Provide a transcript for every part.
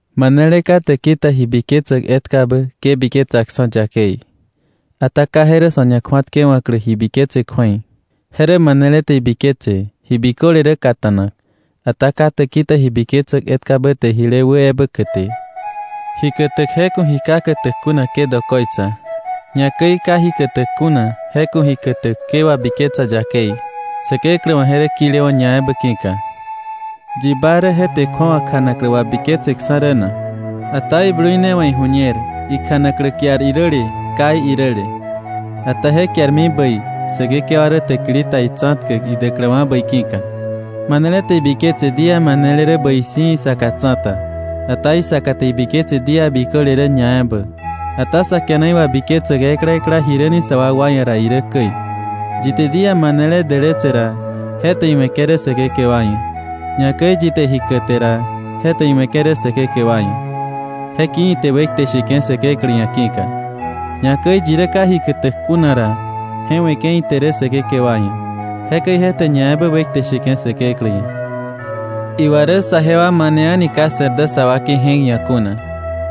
Manele ka täki ta ji biketsäk etkabä ke biketsaksa̱ yakei. Ata ka je rä sa̱ ñakju̱atkewa̱klä ji biketse kju̱ei. Je rä manele te ibiketse ji biköle rä kata̱nak, ata ka täki ta ji biketsäk etkabä te jile wä ebä käte. Ji kätäk, je ku̱ ji ka kätäk kuna ke dokoitsa. Ñakäi ka ji kätäk kuna, je ku̱ ji kätäk ke wabiketsa yakei, Säkeklä wa̱ je rä kilewa̱ ñaebä ki̱ka. ¿Yi ba rä je te kju̱awa kjanaklä wabiketseksa̱ rä na? Ata iblui ne wa̱ iju̱ñer ikjanaklä kiar iräle kai iräle. Ata je kiarmi bäi Säkekewa rä täkili ta itsa̱tkäk idäkläwa̱ bäi ki̱ka. Manele te ibiketse día manele rä bäi si̱ isaka tsa̱ta. Ata isaka te ibiketse día biköle rä ñaebä. Ata sa kiana iwabiketsäk ekla ekla jiräni sa wakwa ia̱ ra irä käi. Yi te día manele dälätse ra, je te iwe̱ke̱ rä Säkekewa ia̱. Ñakäi yi te ji käte ra, je te iwe̱ke̱ rä Säkekewa ia̱, je ki̱ ite wekte sheke̱ Säkeklä ia̱ ki̱ka. Ñakäi yi rä ka ji kätäk kuna ra, je we̱ke̱ ite rä Säkekewa ia̱, jekäi je te ñaebä wekte sheke̱ Säkeklä ia̱. Iwa rä saje wa mane a̱ni ka se̱r dä sa wakei je̱k ia̱ kuna.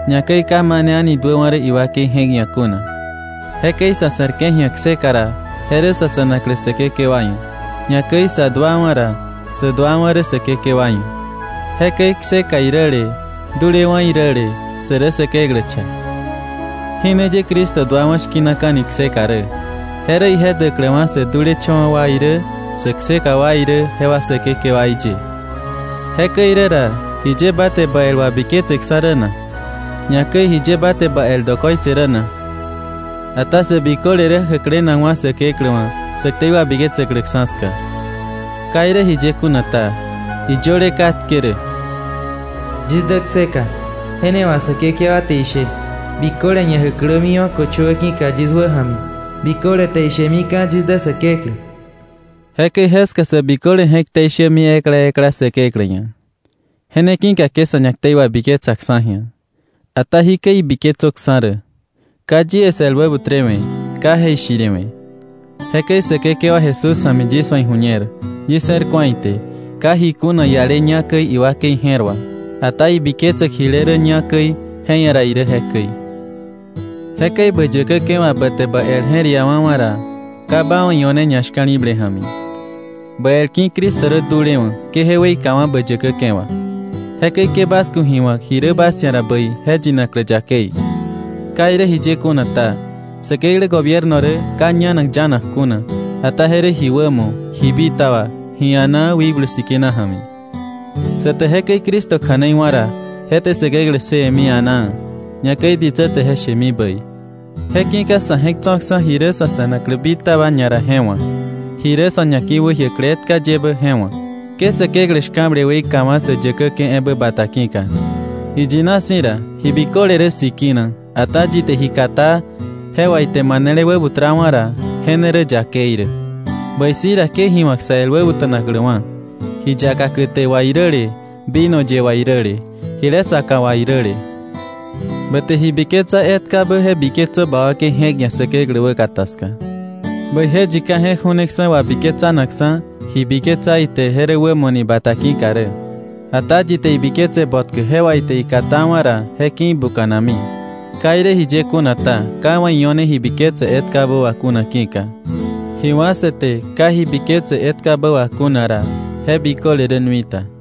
Ñakäi ka mane a̱ni duäwa̱ rä iwakei je̱k ia̱ kuna. Jekäi sa̱ se̱rke̱ ji̱a kseka ra, je rä sa̱ se̱naklä Säkekewa ia̱. Ñakäi sä duawa̱ ra, sä duawa̱ rä Säkekewa ia̱. Jekäi kseka iräle dulewa̱ iräle sä rä Säkeklä cha. Jí ne ye Cristo duawa̱ shki̱naka̱ni kseka rä: je rä ije däkläwa̱ sä dulecha̱wa̱ wa irä sä kseka wa irä jewa Säkekewaí ye. Jekäi rä ra, ¿jiye ba te ba el wabiketseksa̱ rä na? Ñakäi, ¿jiye ba te ba el dokoitse rä na? Ata sä biköle rä jäklenakwa̱ Säkeklä wa̱ sä ktei wabiketsäkläksa̱ ska. Ka irä jiye kuna ta, iyöle katke rä: “Yis dä kseka, je ne wà Säkekewa te ishe, biköle ñajäklämiwa̱ köchöwä ki̱ka yis wäja̱mi, biköle te ishemika̱ yis dä Säkeklä.” Jekäi jeska sä biköle je̱k ktei shämi ekla ekla Säkeklä ia̱. Je ne ki̱ka ke sa̱ ñaktei wabiketsaksa̱ ji̱a. Ata jikäi ibiketsöksa̱ rä: ka yie 's el wäbutrewe̱, ka je̱ ishiriwe̱. Jekäi Säkekewa Jesús ja̱mi yis wa̱ iju̱ñer, yis je̱r ku̱a ite, ka ji kuna iale ñá käi iwakei je̱r wà. Ata ibiketsäk jile rä ñá käi, je ia̱ ra irä jekäi. Jekäi bä yäkäke̱ wà ba te ba el je̱r iawa̱wa̱ ra, ka ba wa̱ io̱ne ñashka̱li̱ble ja̱mi. Ba el ki̱ Cristo rä dulewa̱ ke je weikawa̱ bä yäkäke̱ wà. Jekäi ke bas ku̱ ji wa̱k ji rä bas ia̱ ra bäi je yinaklä yakei. Ka irä jiye kuna ta, Säkeklä gobierno rä ka ñanak yanak kuna, ata je rä ji wämo, ji bitaba, ji a̱naa Wikblu Sikina ja̱mi. Sa te jekäi Cristo kja̱nei wá̱ ra, je te Säkeklä ssëwe̱mi a̱naa, ñakäi ditsä te je shemi bäi. Je ki̱ka sa̱ je̱k tso̱ksa̱ ji rä sa̱ se̱naklä bitaba ñara je wa̱k, ji rä sa̱ ñaki̱wäjiäkläwa̱ etka yebä je wa̱k. Ke Säkeklä shka̱ble weikawa̱ sä yäkäke̱ ebä bata ki̱ka. Iyina si̱ ra, ji biköle rä sikina; ata yi te ji katá je wà ite manele wäbutrawa̱ ra, je ne rä yakei rä. Bäi si̱ ra, ke ji wa̱k sä el wäbuta̱nakläwa̱, ji yaka käte wà iräle, vino ye wà iräle, jile saka wà iräle. Ba te ji biketsa etkabä je biketsö ba wakei je̱k ia̱ Säkeklä wäkata ska. Bäije yi ka je̱k ju̱neksa̱ wabiketsanakksa̱ ji biketsa ite je rä wämo ni bata ki̱ka rä. Ata yi te ibiketse botkä je wà ite ikatawa̱ ra, je ki̱ ibuka̱nami. Ka irä jiye kuna ta, ka iwa̱ io̱ne ji biketse etkabä wà kuna ki̱ka. Ji biköle wá̱ sa te ka ji biketse etkabä wà kuna ra, je rä nui ta.